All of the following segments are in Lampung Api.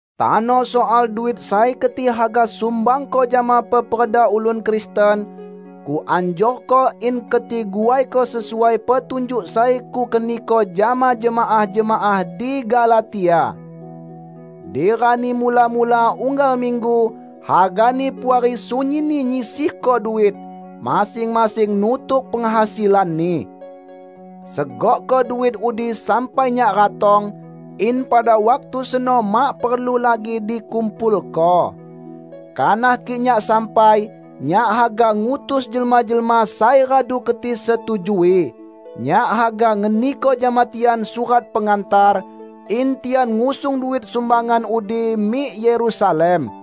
Tano soal duit sai keti haga sumbangko jama peperda ulun Kristen, kuanjurko in keti guaiko sesuai petunjuk sai kukeniko jama jemaah-jemaah di Galatia. Di rani mula-mula unggal minggu, hagani Puari sunyinni nyisihko duit, masing-masing nutuk penghasilanni. Segokko duit udi sampai nyak ratong, in pada waktu seno mak perlu lagi dikumpulko. Kanah kik nyak sampai, nyak haga ngutus jelma-jelma sai radu keti setujui. Nyak haga ngeniko jama tian surat pengantar, in tian ngusung duit sumbangan udi mik Yerusalem.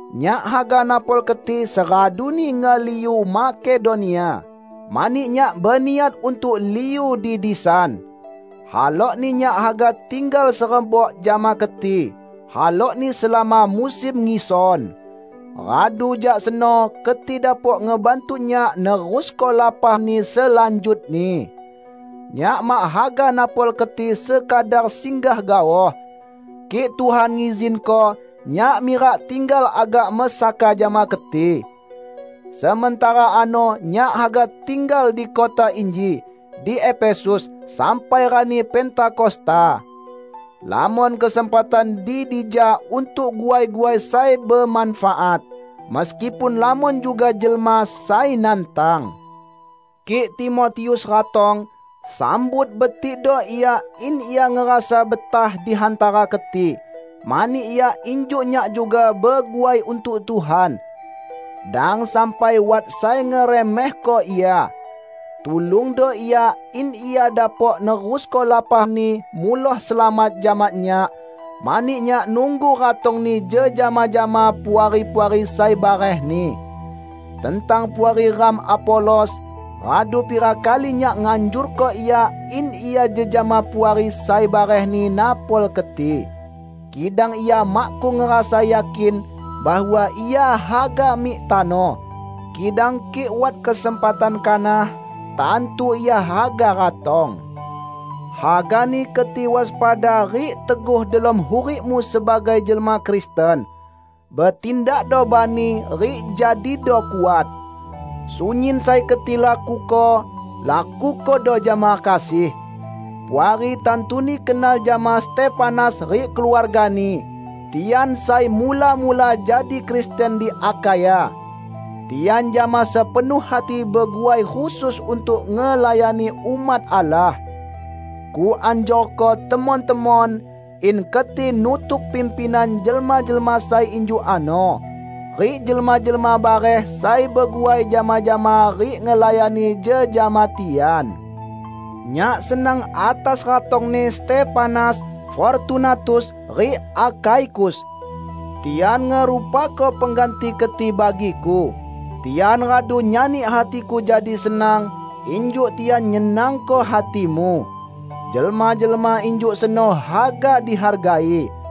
Nyak haga napol keti seraduni ngeliu Makedonia, mani nyak beniat untuk liu di disan. Halokni nyak haga tinggal serebok jama keti, halokni selama musim ngison. Radu jak seno keti dapok ngebantu nyak nerusko lapahni selanjutni. Nyak mak haga napol keti sekadar singgah gaoh. Kik Tuhan ngizinko, nyak mirak tinggal agak mesaka jama keti. Sementara ano nyak haga tinggal di kota inji, di Efesus, sampai rani Pentakosta. Lamon kesempatan di dija untuk guai-guai sai bemanfaat, meskipun lamon juga jelma sai nantang. Kik Timotius ratong, sambut betikdo ia in ia ngerasa betah di hantara keti, mani ia injuk nyak juga beguai untuk Tuhan. Dang sampai wat sai ngeremehko ia. Tulungdo ia in ia dapok nerusko lapahni muloh selamat jama nyak, mani nyak nunggu ratongni jejama jama puari-puari sai barehni. Tentang puari ram Apolos, radu pira kali nyak nganjurko ia in ia jejama puari sai barehni napol keti. Kidang ia makkung ngerasa yakin bahwa ia haga mik tano. Kidang kik wat kesempatan kanah, tantu ia haga ratong. Hagani keti waspada rik teguh delom hurikmu sebagai jelma Kristen. Betindakdo bani rik jadido kuat. Sunyin sai keti lakuko, lakukodo jama kasih. Puari tantuni kenal jama Stefanas rik keluargani; tian sai mula-mula jadi Kristen di Akhaya. Tian jama sepenuh hati beguai khusus untuk ngelayani umat Allah. Kuanjurko temon-temon in keti nutuk pimpinan jelma-jelma sai injuk ano, rik jelma-jelma bareh sai beguai jama-jama rik ngelayani jejama tian. Nyak senang atas ratongni Stefanas, Fortunatus rik Akhaikus. Tian ngerupako pengganti keti bagiku. Tian radu nyani hatiku jadi senang, injuk tian nyenangko hatimu. Jelma-jelma injuk seno haga dihargai.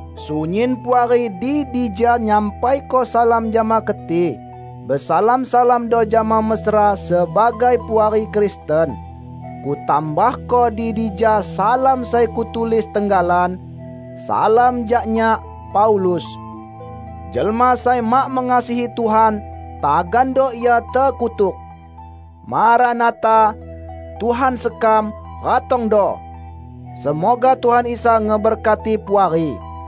Sunyin puari di dija nyampaiko salam jama keti. Besalam-salamdo jama mesra sebagai puari Kristen. Kutambahko di dija salam sai kutulis tenggalan: Salam jak nyak, Paulus. Jelma sai mak mengasihi Tuhan, tagando ia tekutuk! Maranatha -- Tuhan sekam, ratongdo! Semoga Tuhan Isa ngeberkati Puari.